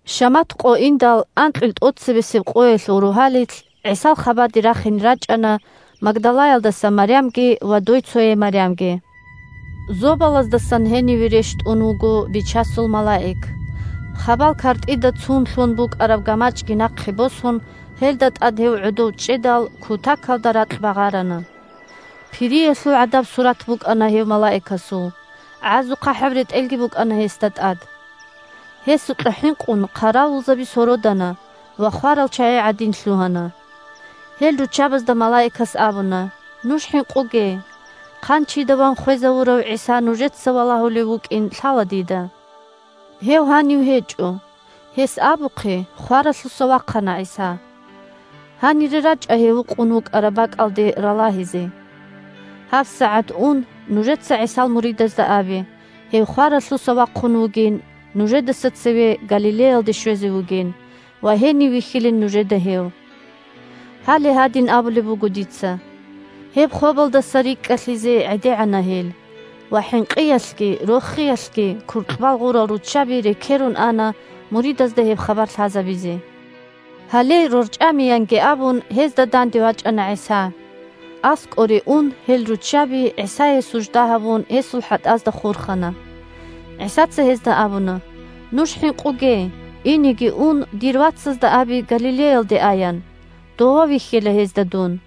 Шамат къо индал, анкьил тӀоцебесеб къоялъул рогьалилъ, ГӀисал хабаде рахине рачӀана Магдалаялдаса Марямги ва дойцояй Марямги. Зобалаздасан гьениве рещтӀун вуго Бичасул малаик. Хабал картӀида цун лъун букӀараб гамачӀги нахъе босун, гьелда тӀад гьев гӀодов чӀедал, кутакалда ракь багъарана. Пириялъул гӀадаб сурат букӀана гьев малаикасул, гӀазухъахӀаб ретӀелги букӀана гьесда тӀад. Гьесукьа хӀинкъун хъаравулзаби сородана ва хварал чагӀи гӀадин лъугьана. Гьел руччабазда малаикас абуна: – Нуж хӀинкъуге! Хъанчида ван хвезавурав ГӀиса нужеца валагьулев вукӀин лъала дида. Гьев гьанив гьечӀо. Гьес абухъе, хваралъуса вахъана ГӀиса. Гьанире рачӀа гьев вукъун вукӀараб бакӀалде ралагьизе. ГьабсагӀат ун нужеца ГӀисал муридазда абе, гьев хваралъуса вахъун вугин, нужедаса цеве Галилеялде щвезе вугин ва гьенив вихьилин нужеда гьев. Гьале гьадин абулеб буго дица. Гьеб хобалдаса рикӀкӀалъизе гӀедегӀана гьел, ва хӀинкъиялъги рохиялъги куркьбал гъурал руччаби рекерун ана муридазда гьеб хабар лъазабизе. Гьале, рорчӀамиянги абун, гьезда данде вачӀана ГӀиса. АскӀоре ун, гьел руччаби, ГӀисае сужда гьабун, гьесул хӀатӀазда хурхана. ГӀисаца гьезда абуна: – Нуж хӀинкъуге! Инеги ун, дир вацазда абе Галилеялде аян. Дова вихьила гьезда дун.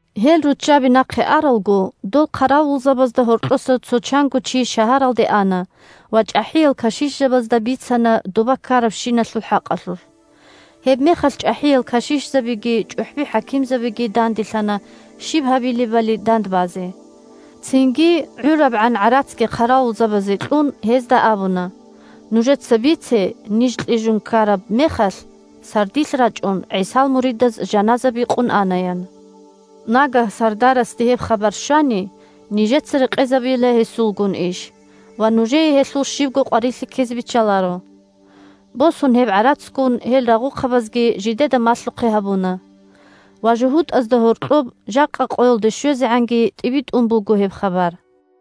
Гьел руччаби нахъе аралго, дол хъаравулзабазда гьоркьоса цо чанго чи шагьаралде ана ва чӀахӀиял кашишзабазда бицана доба ккарабщиналъул хӀакъалъулъ. Гьебмехалъ чӀахӀиял кашишзабиги чӀухӀби-хӀакимзабиги данделъана щиб гьабилебали дандбазе. Цинги, гӀурабгӀан гӀарацги хъаравулзабазе кьун, гьезда абуна: – Нужеца бице: «Ниж кьижун ккараб мехалъ сардилъ рачӀун ГӀисал муридаз жаназа бикъун ана», – ян. Нагагь сардарасде гьеб хабар щвани, нижеца рекъезабила гьесулгун иш ва нужее гьелъул щибго къварилъи ккезе биччаларо. Босун гьеб гӀарацгун, гьел рагъухъабазги жидеда малъухъе гьабуна. Ва жугьутӀазда гьоркьоб жакъа къоялде щвезегӀанги тӀибитӀун буго гьеб хабар.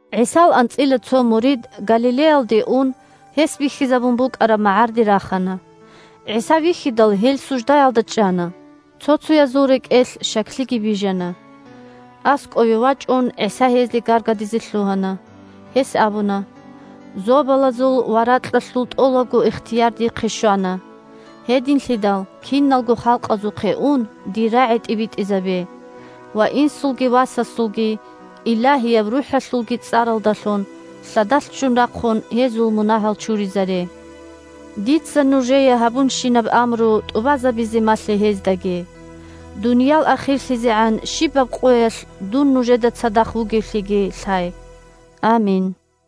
ГӀисал анцӀила цо мурид, Галилеялде ун, гьес бихьизабун букӀараб магӀарде рахана. ГӀиса вихьидал, гьел суждаялда чӀана, цо-цоязул рекӀелъ щаклъиги бижана. АскӀове вачӀун ГӀиса гьезда гаргадизе лъугьана. Гьес абуна: – Зобалазул ва ракьалъул тӀолабго ихтияр дихъе щвана. Гьединлъидал киналго халкъазухъе ун, дир рагӀи тӀибитӀизабе, ва Инсулги, Васасулги, Илагьияб РухӀалъулги цӀаралдалъун, лъадалъ ччун рахъун, гьезул мунагьал чуризаре. Дица нужее гьабунщинаб амру тӀубазабизе малъе гьездаги. Дуниял ахирлъизегӀан щибаб къоялъ дун нужеда цадахъ вугевлъиги лъай. Амин!